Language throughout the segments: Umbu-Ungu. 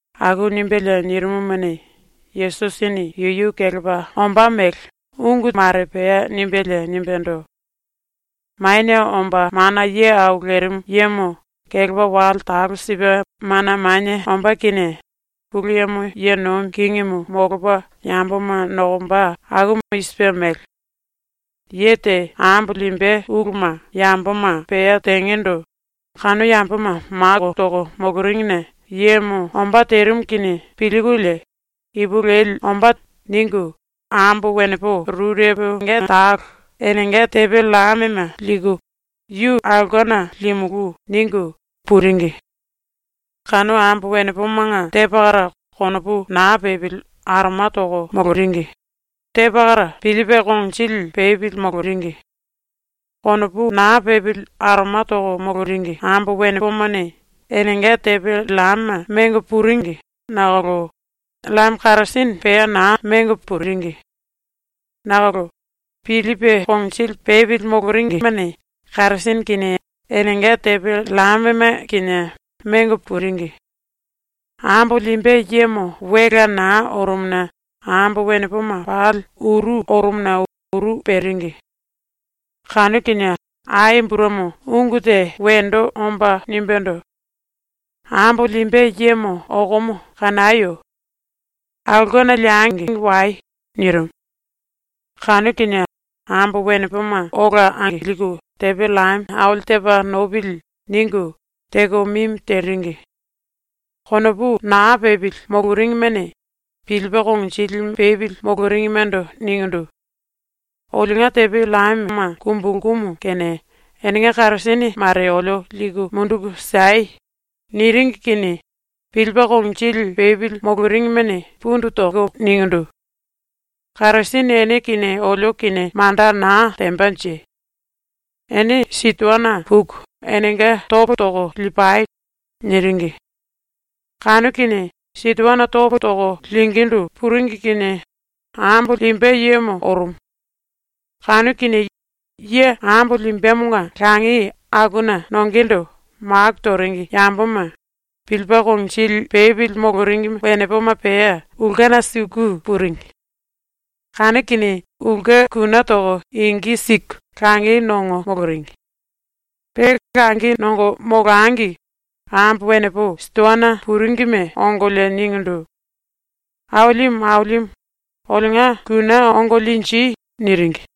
⸤Aku nimbelie nirimumuni, Yesusini yuyu kelepa ombá mele ungu mare pea nimbelie nimbendo:⸥ “⸤Manie Omba Mana Ye Au Lerimu Yemo kelepa wale talo sipe mana manie ombá kinie⸥ Pulu Yemo ye nomi kingimu molopa yamboma nokomba akumu i sipe mele: “Ye te ambo limbe uluma yamboma pea tengendo kanu yamboma maku toko moloringine yemo ombá terimu kinie pilkulie ‘Ipulueli ombá.’ ningu ambo wenepo rureponga talo enenga tepe llamema liku “Yu aulkena limulú.” ningu puringi. Kanu ambo wenepomanga te pakara konopu na pepili aroma toko moloringi; te pakara pilipe konginjili pepili moloringi. Konopu na pepili aroma toko moloringi ambo wenepomane enenga tepe llamema mengo puringi nakolo llame karasene pea na mengo puringi. Nakolo pilipe konginjili pepili moloringimene karasene kinie enenga tepe llamema kinie mengo puringi. Ambo limbe yemo welea na orumuna ambo wenepoma pali uru orumuna uru peringi. Kanu kinie ai burumi ungu te wendo omba nimbendo: “Ambo limbe yemo okomo kanayo! Aulkena liengi wai!” nirimu. Kanu kinie ambo wenepoma ola angilku tepe llame ‘Aili tepa nopili.’ ningu teko mimi teringi. Konopu na pepili moloringimene pilipe konginjili pepili moloringimendo ningindu: “Olionga tepe llamema kumbulkumu kene enenga karasene mare olio liku munduku siei.” niringi kinie pilipe konginjili pepili moloringimene pundu toko ningindu: “Karasene ene kinie olio kinie manda na tembanje. Ene sitoana puku enenga topo toko lipai.” niringi. Kanu kinie sitoana topo toko lingíndu puringi kinie ambo limbe yemo orumu. Kanu kinie ye ambo limbemonga langi akuna nongendo maku toringi yamboma, pilipe konginjili pepili moloringi wenepoma pea ulkena suku puringi. Kanu kinie ulke kune toko ingi siku langi nongo moloringi. Pe langi nongo molangi ambo wenepo sitoana puringime ongolie ningindu: “Ailimu, Ailimu, olionga kune ongo linji.” niringi.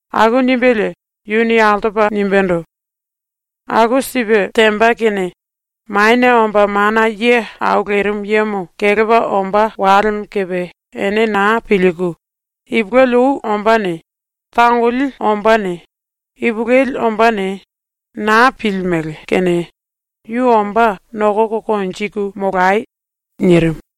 ⸤Aku nimbelie yuni altopa nimbendo:⸥ “Aku sipe temba kene Manie Omba Mana Ye Au Lerimu Yemo kelepa ombá walemo kepe ene na pilku, ipulueli ou ombáne tangoli ombáne, ipulueli ombáne, na pilimele kene yu ombá nokoko konjiku molai.” ⸤nirimu.⸥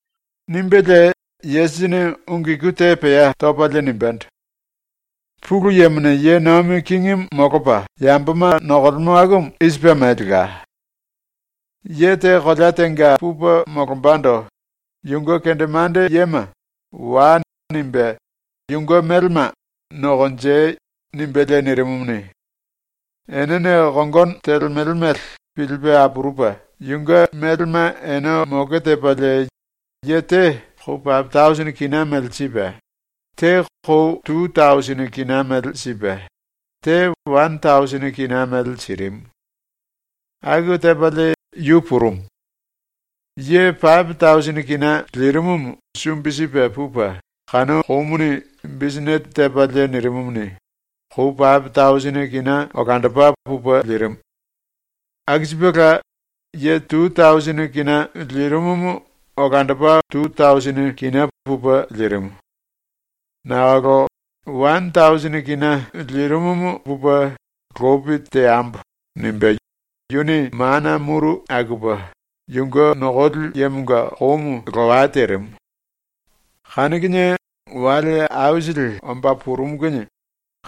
⸤Nimbelie Yesusini ungu iku te pea topalie nimbendo:⸥ “⸤Pulu Yemone ye nomi kingimu molopa yamboma nokolemo akumu⸥ i sipe melela: “Ye te kolea tenga pupe molombando yunge kendemande yema “Wai.” nimbe yunge melema “Nokonjei.” nimbelie nirimumuni, enene kongono telemele mele pilipe apurupe yunge melema ene moke tepalie ye te kou pape tausini kina mele sipe, te kou tu tausini kina mele sipe, te wane tausini kina mele sirimu. Aku tepalie yu purumu. Ye pape tausini kina lirimumu sumbi sipe pupe kanu koumuni bisinete tepalie nirimumuni, kou pape tausini kina olandopa pupe lirimu. Aku sipela ye tu tausini kina lirimumu olandopa tu tausini kina pupe lirimu. Nakolo wane tausini kina lirimumu pupe ‘Lopi teambo.’ nimbe yuni mana muru akupe yunge nokoli yemonga koumu lowa terimu. Kanu kinie wale aisili omba purumu kinie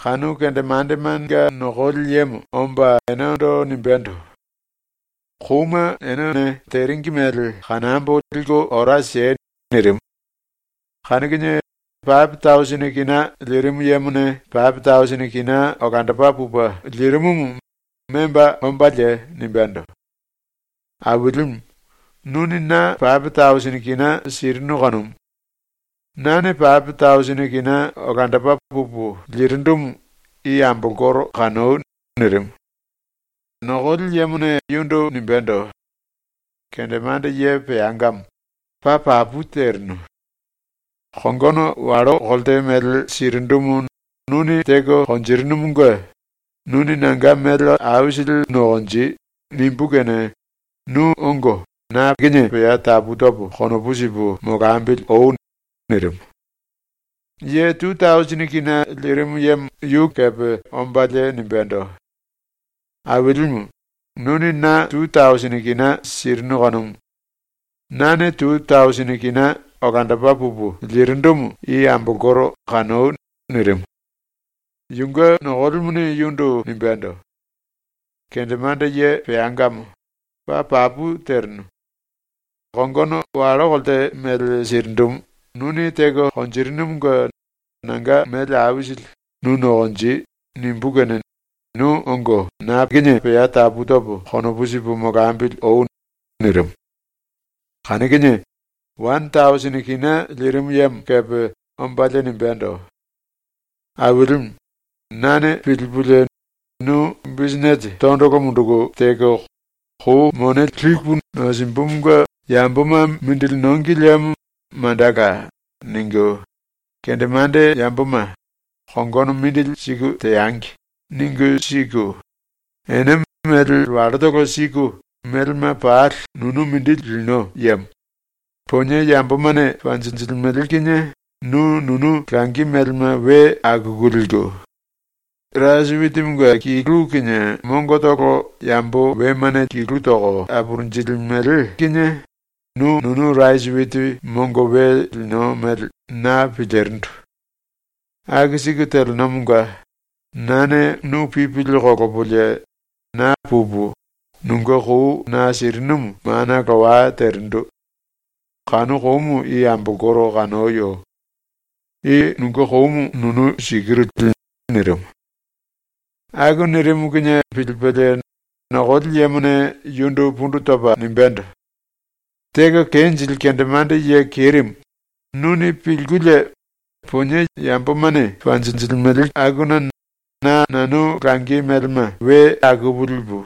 kanu kendemandemanga nokoli yemo omba enendo nimbendo: “Kouma ene teringi mele kanambo liku ora siei.” nirimu. Kanu kinie pape tausini kina lirimu yemone pape tausini kina olandopa pupe lirimumu memba ombalie nimbendo: “Ailimu, nuni na pape tausini kina sirinu kanumu. Nane pape tausini kina olandopa pupu lirindumu i ambolkoro kanoi.” nirimu. Nokoli yemone yundu nimbendo: “Kendemande ye peangamo, paa papu terinu. Kongono wallo kolte mele sirindumu nuni teko konjirinumunge “Nuni nanga mele aisili nokonji.” nimbú kene nu ongo na pea tapu topo konopu sipu molambili oi.” nirimu. Ye tu tausini kina lirimu yemo yu kepe ombalie nimbendo: “Ailimu, nuni na tu tausini kina sirinu kanumu. Nane tu tausini kina olandopa pupu lirindumu i ambolkoro kanoi.” nirimu. Yunge nokolimuni yundu nimbendo: “Kendemande ye peangamo, paa papu terinu. Kongono wallo kolte mele sirindumu nuni teko konjirinumunge nanga mele aisili “Nu nokonji.” nimbú kene nu ongo na pea tapu topo konopu sipu molambili oi.” nirimu. Kanu kinie wane tausini kina lirimu yemo kepe ombalie nimbendo: “Ailimu, nane pilipulie, ‘Nu bisinete tondolo munduku teko ‘Kou mone lipu nosimbumunge yamboma mindili nongi liemo mandala.’ ningu ⸤kendemande yamboma ‘Kongono mindili siku teangi.’ ningu siku, ene mele wallotolo siku melema pali nunu mindi lino yemo;⸥ ponie yambomane panjinjilimele kinie nu nunu langi melema we akuku liku; rasi witimunge kilu kinie mongotolo yambo wemane kilu toko apurunjilimele kinie nu nunu rasi witi mongo we lino mele.’ na pilirindu. ⸤Aku siku telenomonga⸥ nane nu pipili kolopolie na pupu nunge kou na sirinumu mana lowa terindu. Kanu koumu i ambolkoro kanoyo. I nunge koumu nunu sikiru li.” nirimu. Aku nirimu kinie pilipelie nokoli yemone yundu pundu topa nimbendo: “Teko kenjili kendemande ye kerimu, nuni pilkulie, ‘Ponie yambomane panjinjilimele akuna na nanu langi melema we akupu lipu;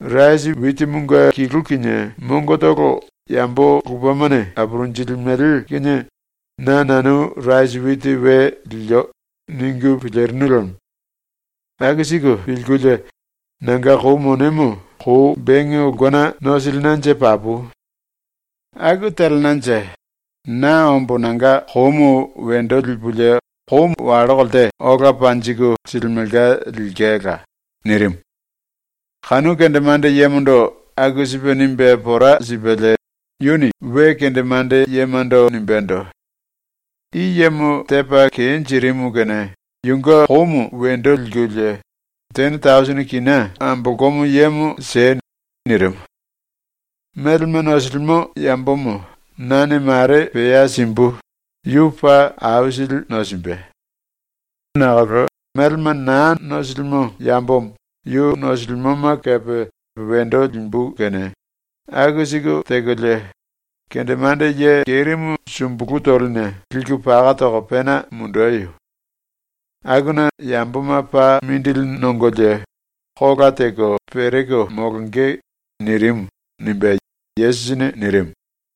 rasi witimunge kilu kinie mongotolo yambo lupemane apurunjilimele kinie na nanu rasi witi we lio.’ ningu pilirinu lemo. Aku siku pilkulie nanga kou monemo kou benge ulkena nosilinanje papu. Aku telenanje na ombo nanga koumu wendo lipulie kou wallo kolte ola panjiku silimelka lilkela.” ⸤nirimu.⸥ ⸤Kanu kendemande yemondo aku sipe nimbe pora sipelie yuni we kendemande yemando nimbendo:⸥ “I yemo tepa kenjirimu kene yunge koumu wendo likulie tene tausini kina ambolkomo yemo siei.” ⸤nirimu.⸥ “Melema nosilimo yambomo nane mare pea simbu, yu paa aisili nosimbe. Nakolo melema na nosilimo yambomo yu nosilimoma kepe wendo limbu kene aku siku tekolie, kendemande ye kerimu sumbulu toline liku paka toko pena mundeyo. Akuna yamboma paa mindili nongolie kola teko pereko molonge.” nirimu.” ⸤nimbe Yesusini nirimu.⸥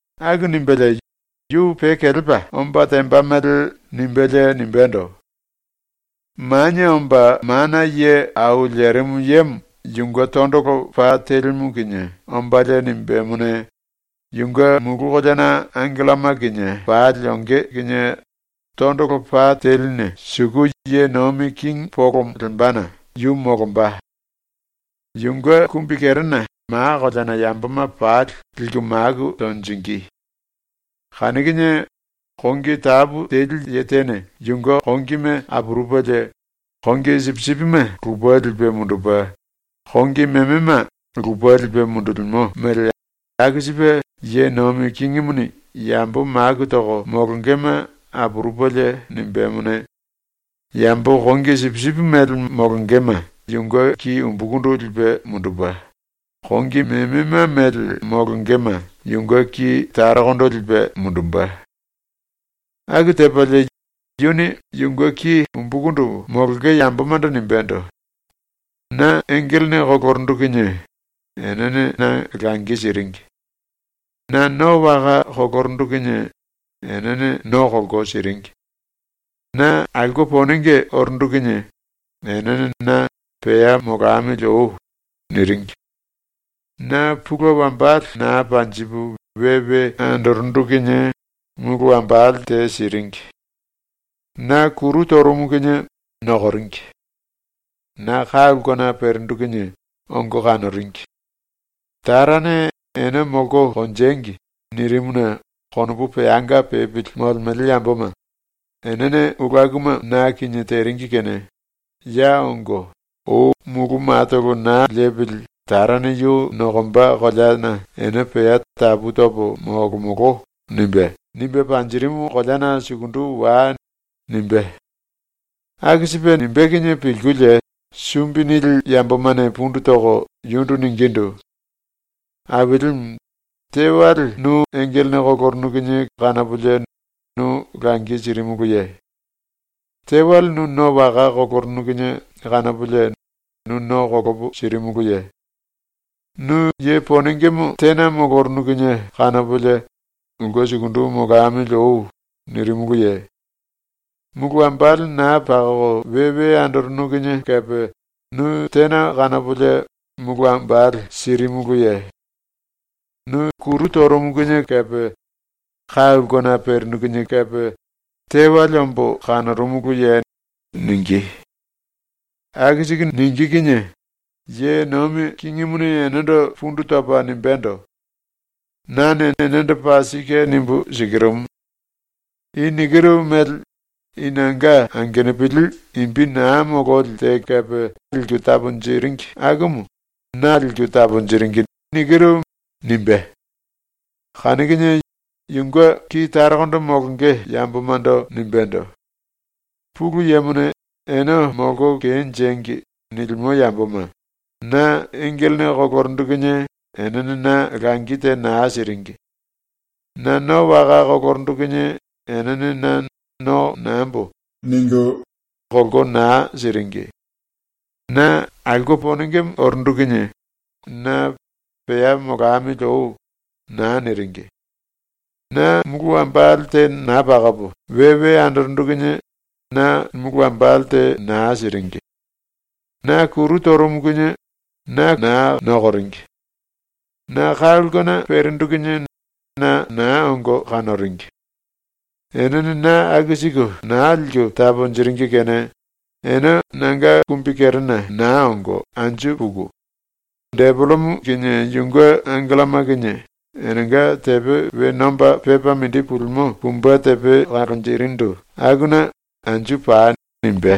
⸤Aku nimbelie yu pe kelepa omba temba mele nimbelie nimbendo:⸥ “Manie Omba Mana Ye A Lerimu Yemo yunge tondolo pa telimu kinie ombalie nimbemone, yunge mulu koleana angelloma kinie pali onge kinie tondolo pa teline suku ye nomi kingi polomo lembana yu molomba. Yunge kumbikerena ma koleana yamboma pali liku maku tonjingí. Kanu kinie kongi tapu teli ye tene yunge kongime apurupelie kongi sipisipime lupe lipe mundupe, kongi memema lupe lipe mundulimo mele aku sipe Ye Nomi Kingimuni yambo maku toko molongema apurupelie nimbemone, yambo kongi sipisipi mele molongema yunge ki umbukundu lipe mundupe, kongi memema mele molongema yunge ki tarokondo lipe mundumbe. Aku tepalie, yuni yunge ki umbukundu molonge yambomando nimbendo: “Na engelene kolorundu kinie enene na langi siringi. Na no waka kolorundu kinie enene no kolko siringi. Na aulke ponenge orundu kinie enene na “Pea molamili oi.” niringi. Na pulue wambale na panjipu we we andorundu kinie mulu wambale te siringi. Na kuru torumu kinie nokoringi. Na ka ulkena perindu kinie ongo kanoringi. Tarane ‘Ene molko konjengi.’ nirimuna konopu peanga pepili molemele yamboma, enene ulu akuma na kinie teringi kene, ya ongo, ou mulu matolo na lepili Tarane yu nokomba koleana ene pea ‘Tapu topo molomolo.’ nimbe, nimbe panjirimu koleana sukundu wai.” nimbé. Aku sipe nimbé kinie pilkulie sumbi nili yambomane pundu toko yundu ningindu: “Ailimu, tewale nu engelene kolorunu kinie kanopolie nu langi sirimuluye? Tewale nu no waka kolorunu kinie kanopolie nu no kolopo sirimuluye? Nu ye ponengemo tena molorunu kinie kanopolie “Ulke sukundu molamili oi.” nirimuluye? Mulu wambale na pakoko we we andorunu kinie kepe nu tena kanopolie mulu wambale sirimuluye? Nu kuru torumu kinie kepe, ka ulkena perinu kinie kepe, tewale ombo kanorumuluye?” ningí. ⸤Aku siku ningí kinie⸥ Ye Nomi Kingimuni enendo pundu topa nimbendo: “Nane enendo paa sike nimbu sikirumu: I nikiru mele i nanga angenupili imbi na mololi te kepe liku taponjiringi akumu na liku taponjiringi.” nimbé. Kanu kinie yunge ki tarokondo molonge yambomando nimbendo: “Pulu Yemone ‘Ene molko kenjengi.’ nilimo yamboma, na engelene kolorundu kinie enene na langi te na siringi. Na no waka kolorundu kinie enene na ‘no nambo.’ ningu kolko na siringi. Na aulke ponengemo orundu kinie na “Pea molamili oi.” na niringi. Na mulu wambale te na pakopo we we andorundu kinie na mulu wambale te na siringi. Na kuru torumu kinie na na nokoringi. Na ka ulkena perindu kinie na na ongo kanoringi. ⸤Enene na aku siku na liku taponjiringi⸥ kene ene nanga kumbikerena na ongo anju puku, depelemo kinie yunge angelloma kinie enenga tepe we nomba pepa mindi pulimo pumbe tepe kalonjirindu akuna anju pai.” nimbé.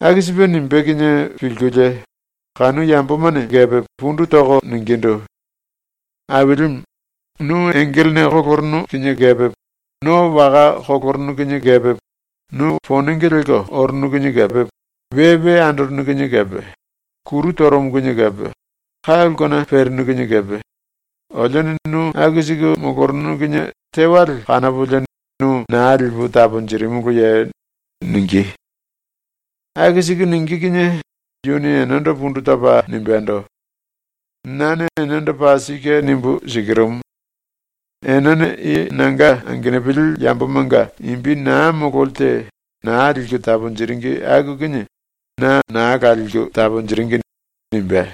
Aku sipe nimbé kinie pilkulie kanu yambomane kepe pundu toko ningindu: “Ailimu, nu engelene kolorunu kinie kepe, no waka kolorunu kinie kepe, nu ponenge lelko orunu kinie kepe, we we andorunu kinie kepe, kuru torumu kinie kepe, ka ulkena perinu kinie kepe, olione nu aku siku molorunu kinie tewale kanopolie nu na lipu taponjirimuluye?” ningí. ⸤Aku siku ningí kinie⸥ yuni enendo pundu topa nimbendo: “Nane enendo paa sike nimbu sikirumu: Enene i nanga angenupili yambomanga imbi na mololi te na liku taponjiringi aku kinie na naa la liku taponjiringi.” nimbé.